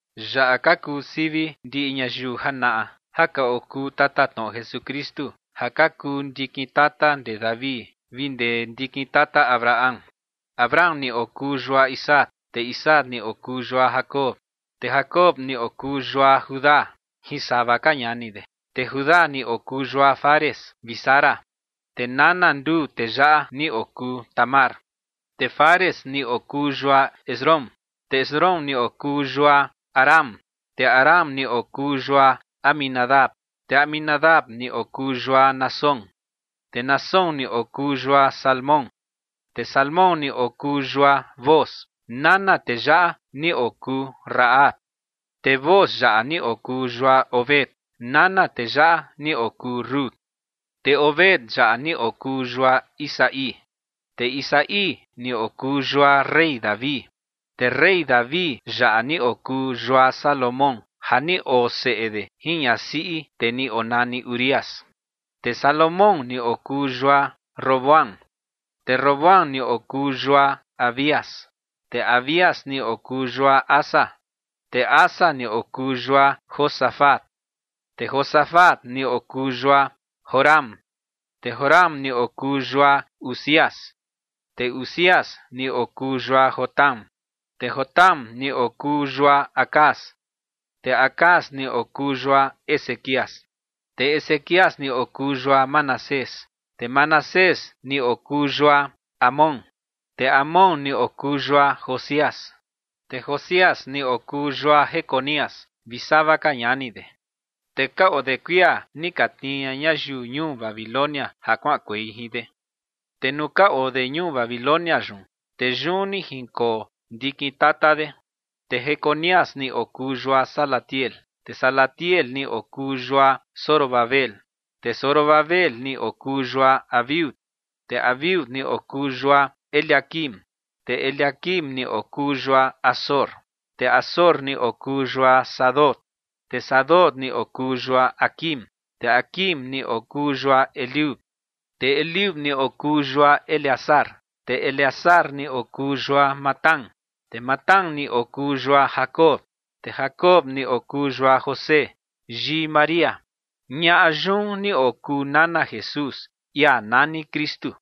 Yaꞌa ka kuu sivi ndiꞌi ñayiu janaꞌa ja ka okuu tatatnoꞌo Jesukristu ja ka kuu ndikin tata ndee David vi ndee ndikin tata Abraham. Abraham ni okuu yua Isaac, te Isaac ni okuu yua Jacob, te Jacob ni okuu yua Judá jin sava ka ñani de. Te Judá ni okuu yua Fares vi Zara, te nana nduu tee yaꞌa ni okuu Tamar. Te Fares ni okuu yua Esrom, te Esrom ni okuu yua Aram. Te Aram ni okuu yua Aminadab, te Aminadab ni okuu yua Naasón. Te Naasón ni okuu yua Salmón. Te Salmón ni okuu yua Booz. Nana tee yaꞌa ni okuu Rahab. Te Booz yaꞌa ni okuu yua Obed. Nana tee yaꞌa ni okuu Rut. Te Obed yaꞌa ni okuu yua Isaí. Te Isaí ni okuu yua rey David. Te rey David yaꞌa ni okuu yua Salomón ja ni oo seꞌe de jin ñasiꞌi tee ni onani Urías. Te Salomón ni okuu yua Roboam. Te Roboam ni okuu yua Abías. Te Abías ni okuu yua Asa. Te Asa ni okuu yua Josafat. Te Josafat ni okuu yua Joram. Te Joram ni okuu yua Uzías. Te Uzías ni okuu yua Jotam. Te Jotam ni okuu yua Acaz. Te Acaz ni okuu yua Ezequías. Te Ezequías ni okuu yua Manasés. Te Manasés ni okuu yua Amón. Te Amón ni okuu yua Josías. Te Josías ni okuu yua Jeconías vi sava ka ñani de. Te ka oo de kuia ni ka tnii ña ñayiu ñuu Babilonia ja kuaꞌankuei jin de. Te nuu ka oo de ñuu Babilonia yun, te yun ni jinkoo ndikin tata de. Te Jeconías ni okuu yua Salatiel, te Salatiel ni okuu yua Zorobabel. Te Zorobabel ni okuu yua Abiud. Te Abiud ni okuu yua Eliaquim. Te Eliaquim ni okuu yua Azor. Te Azor ni okuu yua Sadoc. Te Sadoc ni okuu yua Aquim. Te Aquim ni okuu yua Eliud. Te Eliud ni okuu yua Eleazar. Te Eleazar ni okuu yua Matán. Te Matán ni okuu yua Jacob. Te Jacob ni okuu yua José yii María. Ñaꞌa yun ni okuu nana Jesús, ia nani Kristu.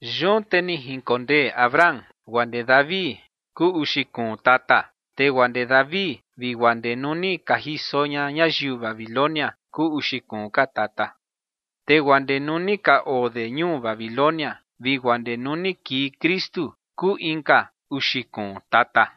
Yun te ni jinkondee Abraham guaa ndee David kuu uxi kuun tata. Te guaa ndee David vi guaa ndee nuu ni ka jiso ña ñayiu Babilonia kuu uxi kuun ka tata. Te guaa ndee nuu ni ka oo de ñuu Babilonia vi guaa ndee nuu ni kii Kristu kuu inka uxi kuun tata.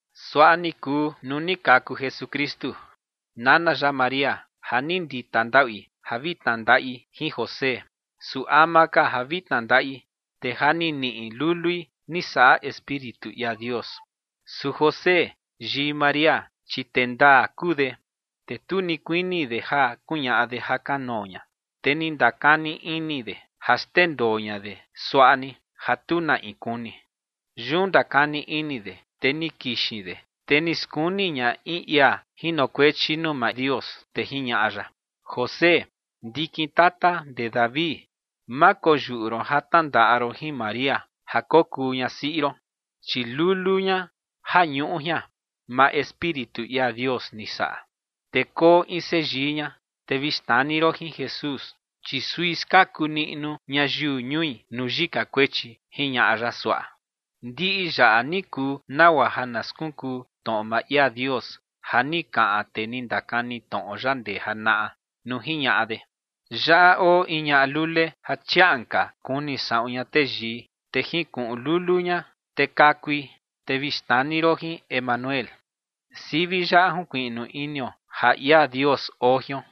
Suaꞌa ni kuu nuu ni kaku Jesukristu. Nana ya María, ja ni ndita ndaꞌui ja vi tnandaꞌi jin José, su ama ka ja vi tnandaꞌi, te ja ni niꞌi lului ni saꞌa Espíritu ia Dios. Su José yii María, chi tee ndaa kuu de, te tu ni kuini de ja kuñaꞌa de jakanoo ña, te ni ndakani ini de ja xndendoo ña de suaꞌa ni, ja tu na in kuni. Yun ndakani ini de, te ni kixin de, te ni skuni ña in ia jinokuechi nuu maa Dios, te jiñaꞌa ya: ͏―͏José, ndikin tata ndee David, ma koyuꞌu ron ja tnandaꞌa ron jin María ja kokuu ñasiꞌi ron, chi lulu ña ja ñuꞌu jian, maa Espíritu ia Dios ni saꞌa. Te koo in seyii ña, te vi xnani ron jin Jesús, chi sui skaku niꞌnu ñayiu ñui nuu yika kuechi ͏―͏jiñaꞌa ya suaꞌa. Ndiꞌi yaꞌa ni kuu nagua ja na skunkuu tnoꞌo maa ia Dios ja ni kaꞌan tee ni ndakani tnoꞌo ya ndee janaꞌa nuu jiñaꞌa de: Yaꞌa oo in ñaꞌa lule ja chiaꞌan ka kuni saꞌun ña teyii, te jinkuꞌun lulu ña, te kakui, te vi xnani ron jin Emanuel. Sivi yaꞌa junkuiꞌnu inio ja ia Dios oo jion.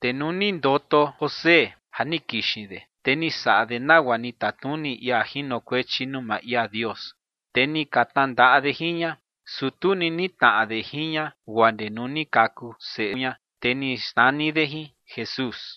Te nuu ni ndoto José ja ni kixin de, te ni saꞌa de nagua ni tatnuni ia jinokuechi nuu maa ia Dios, te ni ka tnandaꞌa de jin ña. Su tu ni nitnaꞌa de jin ña guaa ndee nuu ni kaku seꞌe ña, te ni xnani de jin Jesús.